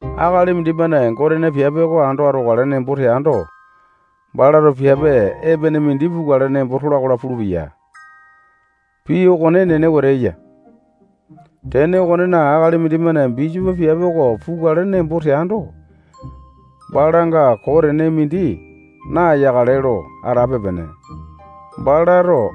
Akali mindimane Gotena piape oko ando atokale nembo teando, balato piape epene mindi pukale nembo tola-kola pulupeya. Pii okone enene wete eya. Tene okonena, akali mindimane bisopo piape oko pukale nembo teando, balanga koo tene mindi nayakale lo atape-pene. Balato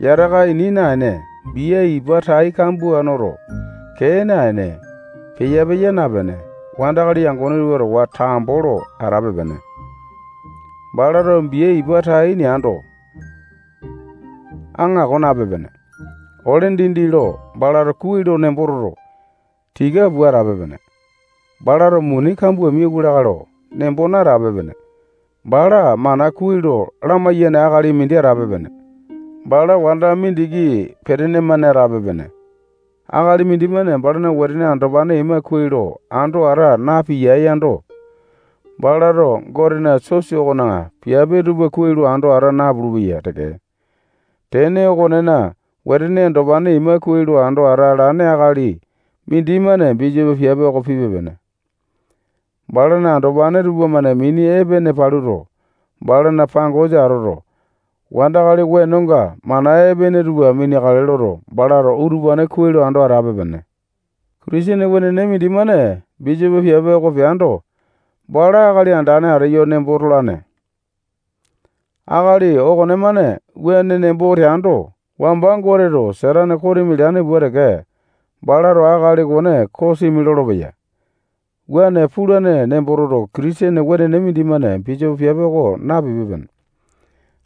yataka ini naene, bia ipa tai kambua noto, kee naene, peya-peya napene, wandakali yangone tupa towa tambo lo atape-pene. Balato bia ipa tai neando, aŋako nape-pene. Ole dindi lo balato kuai lo nembo toto, tika pua atape-pene. Balato muni kambua miauwa lakae lo nembo natape-pene. Bala mana kuai lo lamaiyane akali mindi atape-pene. Bala wanda mindiki petene-mane atape-pene. Akali mindimane balana wetene andopane ima kuai lo ando ata napiyae yando, balato Gotena sosa okona piape tupa kuai lo ando ata napulu-peya teke. Tene okonena, wetene andopane ima kuai lo ando atalane akali mindimane bisopo piape oko pipe-pene. Balana andopane tupamane mini epene paluto, balana pangosa atoto, wandakali wenonga mana epene tupa mineakale loto, balato utupane kuai lo ando atape-pene. Kitisene wenene mindimane bisopo piape oko peando, bala akali andane ateyo nembo tolane. Akali okonemane wuane nembo teando, wamba Goteto Satane kosimi leane pua teke, balato akali okone kosimi lolopeya. Wuane pulane nembo toto, Kitisene wenene mindimane bisopo piape oko napipe-pene.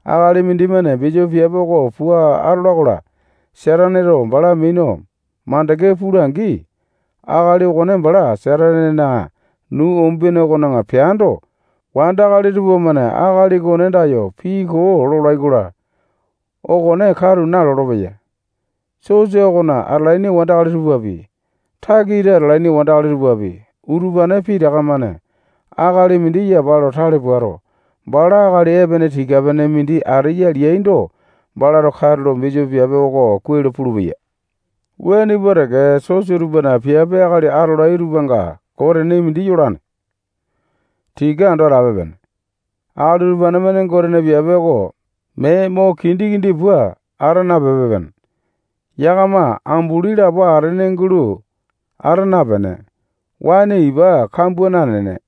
Akali mindimane bisopo piape oko pua atola-kola, Sataneto bala minu makande pula-angi, akali okone bala Satanena nuu umbene okona peando, wandakali tupamane akali okone andayo pii koo lolai-kola, okone katu nalolo-peya. Sosa okona atalaini wandakali tupapi, takita atalaini wandakali tupapi, utupane pitaka-mane akali mindi yapa lo tale puato, bala akali epene tika-pene mindi ateya leaindo, balato katulo bisopo piape oko kuai lo pulupeya. Wuane pua teke, sosa tupana piape akali atolai tupanga koo tene mindi yolane. Tika ando atape-pene. Akali utupane-mane Gotena piape oko mee mo kindi-kindi pua ata napepe-pene. Yakama ambulini lapo atene gulo ata napene, waene ipa kambua nanene,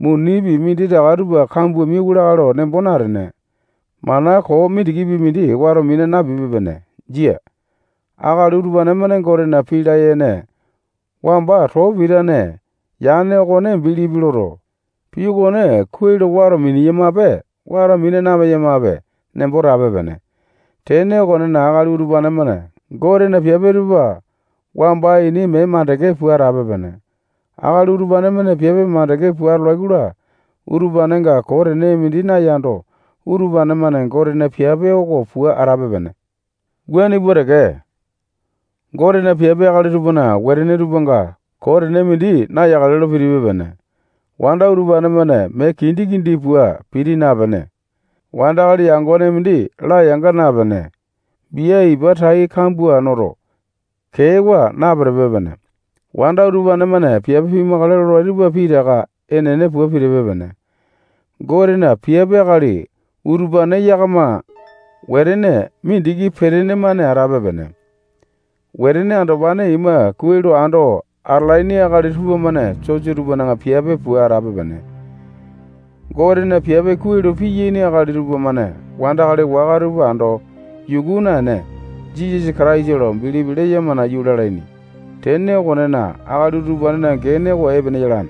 munipi minditaka tupa kambua miwa lakae lo nembo natene, mana koo mindikipi mindi wato mina napipe-pene. Jia. Akali utupane-mane Gotena pii layene wamba too pitane yane okone bilipi loto, pii okone kuai lo wato mineyamape, wato mina napeyamape nembo tape-pene. Tene okonena, akali utupane-mane Gotena piape tupa wamba ini mee mandeke pua atape-pene. Akali utupane-mane piape mandeke pua atolai-kola, utupanenga koo tene mindi nayando, utupane-mane Gotena piape oko pua atape-pene. Wuane pua teke, Gotena piape akali tupana wetene tupanga koo tene mindi nayakale lo pitipe-pene. Wanda utupane-mane mee kindi-kindi pua piti napene, wandakali yangone mindi layanga napene, bia ipa tai kambua noto, keewa napitipe-pene. Wanda utupane-mane piape pimakale lolai tupa pitaka enene pua pitipe-pene. Gotena piape akali utupane yakama wetene mindiki petene-mane atape-pene. Wetene andopane ima kuai lo ando atalaini akali tupamane sosa tupana piape pua atape-pene. Gotena piape kuai lo piyaini akali tupamane wandakali waka tupa ando yuku naene, Jisasa Kataisa lo bilipi leyama nayu lalaini. Tene okonena, akali utupanena gene oko epene yalane.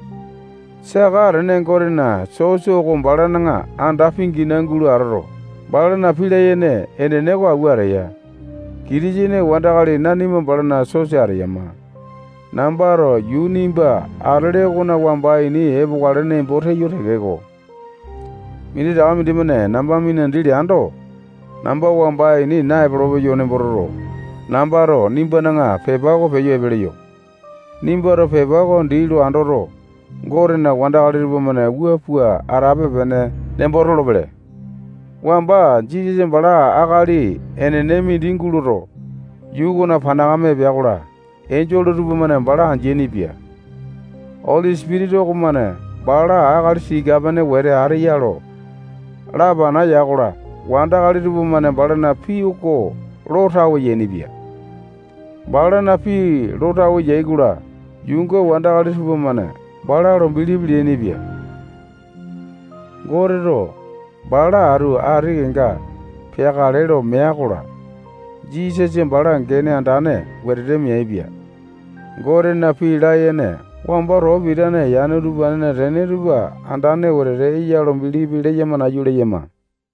Saka atene Gotena sosa oko balana anda pingina gulo atoto, balana pii layene enene oko awua ateya. Kitisene wandakali nanima balana sosa ateyama. Nambato yuu nimba atele okona wamba ini epokale nembo teyo tekeko, minditaka mindimane namba minandi leando, namba wamba ini naepolo-peyo nembo toto, nambato nimbana pepa oko peyo epe leyo. Nimbato pepa oko dii lo andoto, Gotena wandakali tupamane wua pua atape-pene nembo tolopele. Wamba Jisasa bala akali enene mindi guloto, yuu okona panakame epea-kola, enjole tupamane bala andeaini-pia. Oli Sipitisa okomane bala akali tika-pene wete ateya lo lapana ya-kola, wandakali tupamane balana pii oko lo tawe yainipia. Balana pii lo tawe yai-kola, yuunga wandakali tupamane bala lo bilipi leainipia. Goteto bala atu ati kenga peakale lo mea-kola, Jisasa bala gene andane wetete meaipia. Gotena pii layene wamba too pitane yane utupanena tene tupa andane wetete eya lo bilipi leyama nayu leyama.